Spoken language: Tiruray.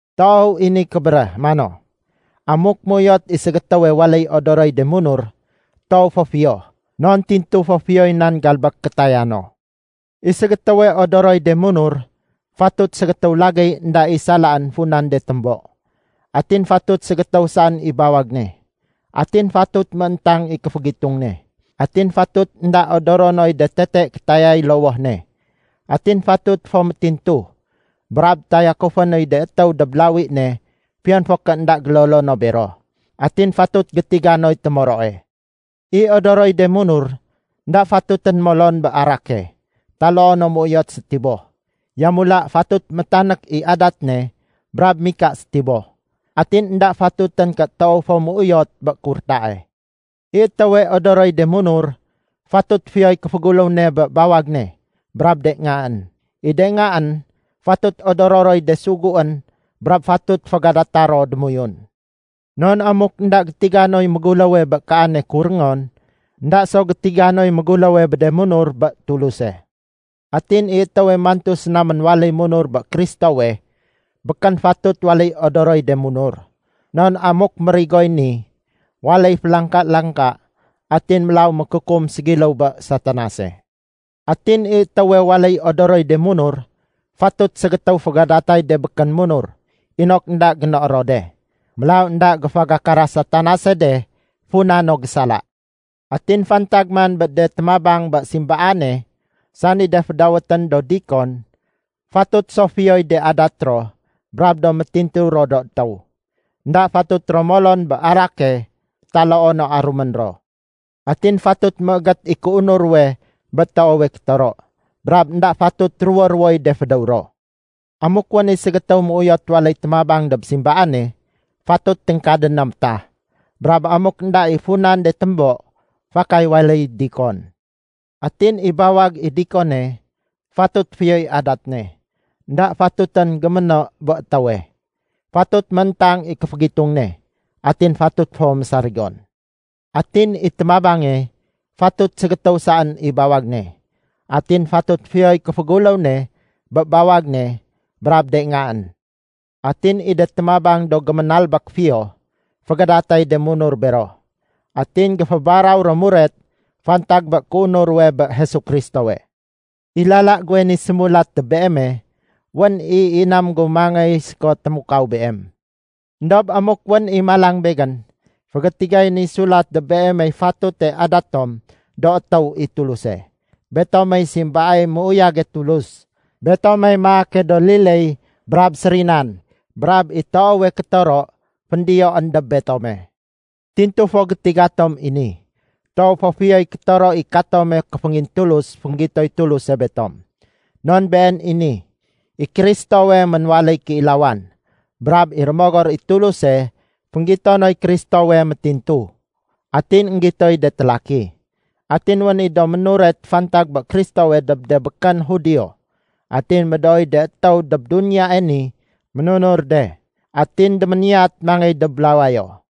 Toow i ni kébéréh mano, “Amuk méuyot i ségétéwe waléy odoroy de munur, toow fo fiyo, non tintu fo fiyoy nan galbék kétaya no.” I ségétéwe odoroy de munur fatut ségétéw lagéy énda i salaén funan de témbo. Atin fatut ségétéw saén i bawag ne. Atin fatut mééntang i kéfégitung ne. Atin fatut énda odoro noy de tete kétayay lowoh ne. Atin fatut fo métintu, brab tayakufé noy de étéw dob lawi ne fiyon fo ké énda gélolo no bero. Atin fatut gétiga noy témoroe. I odoroy de munur énda fatutén molon bé arake taloo no méuyot sétiboh. Yamula fatut métanék i adat ne brab mika sétiboh. Atin énda fatutén ké toow fo méuyot bé kurtae. I étéwe odoroy de munur, fatut fiyoy kéféguléw ne bé bawag ne brab de ngaén. I de ngaén fatut odoro roy de suguén brab fatut fégadata ro démoyun. Non amuk énda gétiga noy méguléwe bé kaane kuréngon, énda so gétiga noy méguléwe bé de munur bé Tuluse. Atin i étéwe mantu séna ménwaléy munur bé Kristowe, békén fatut waléy odoroy de munur. Non amuk mérigoy ni, waléy félangka-langka atin mélaw mékukum ségiléw bé Satanase. Atin i étéwe waléy odoroy de munur, fatut ségétéw fégadatay de békén munur inok énda génoé ro de. Mélaw énda géfégakara Satanase de funa no gésala. Atin fantag man bé de témabang bé simbaane, sani de fédawétén do “dikon”, fatut so fiyoy de adat ro brab do métintu ro do étéw. Enda fatut ro molon bé arake taloo no arumén ro. Atin fatut méégét i kéunur ruwe bé toowe kétoro, brab énda fatut ruwo-ruwoy de fédéw ro. Amuk wén i ségétéw méuyot waléy témabang dob simbaane, fatut téngkadén na métah. Brab amuk énda i funan de témbo, fakay waléy “dikon”. Atin i bawag i dikone, fatut fiyoy adat ne. Enda fatutén géméno bé étéwe. Fatut mééntang i kéfégitung ne. Atin fatut fo mésarigon. Atin i témabange, fatut ségétéw saén i bawag ne. Atin fatut fiyoy kéféguléw ne bé bawag ne brab de ngaén. Atin i de témabang do géménalbék fiyo, fégadatay de munur bero. Atin géfébaraw ro muret fantag bé kéunur ruwe bé Jesu Kristowe. I lala guwe ni sémulat dob beeme, wén i inam gu mangéy séko témukaw beem. Endob amuk wén i malang begén, fégétigay ni sulat dob beemey fatute adat tom do étéw i Tuluse. Betomey simbaay méuyage Tulus. Betomey maake do liléy brab sérinan, brab i toowe kétoro féndiyoén dob betome. Tintu fo gétiga tom i ni: Toow fo fiyoy kétoro i katome kéféngintulus fénggitoy Tuluse betom. Non been i ni: I Kristowe ménwaléy kéilawan. Brab i Rémogor i Tuluse fénggito noy Kristowe métintu. Atin énggitoy de télaki. Atin wén i do ménuret fantag bé Kristowe dob de békén Judio. Atin médooy de étéw dob duniyae ni ménunur de. Atin déméniyat mangéy dob lawayo.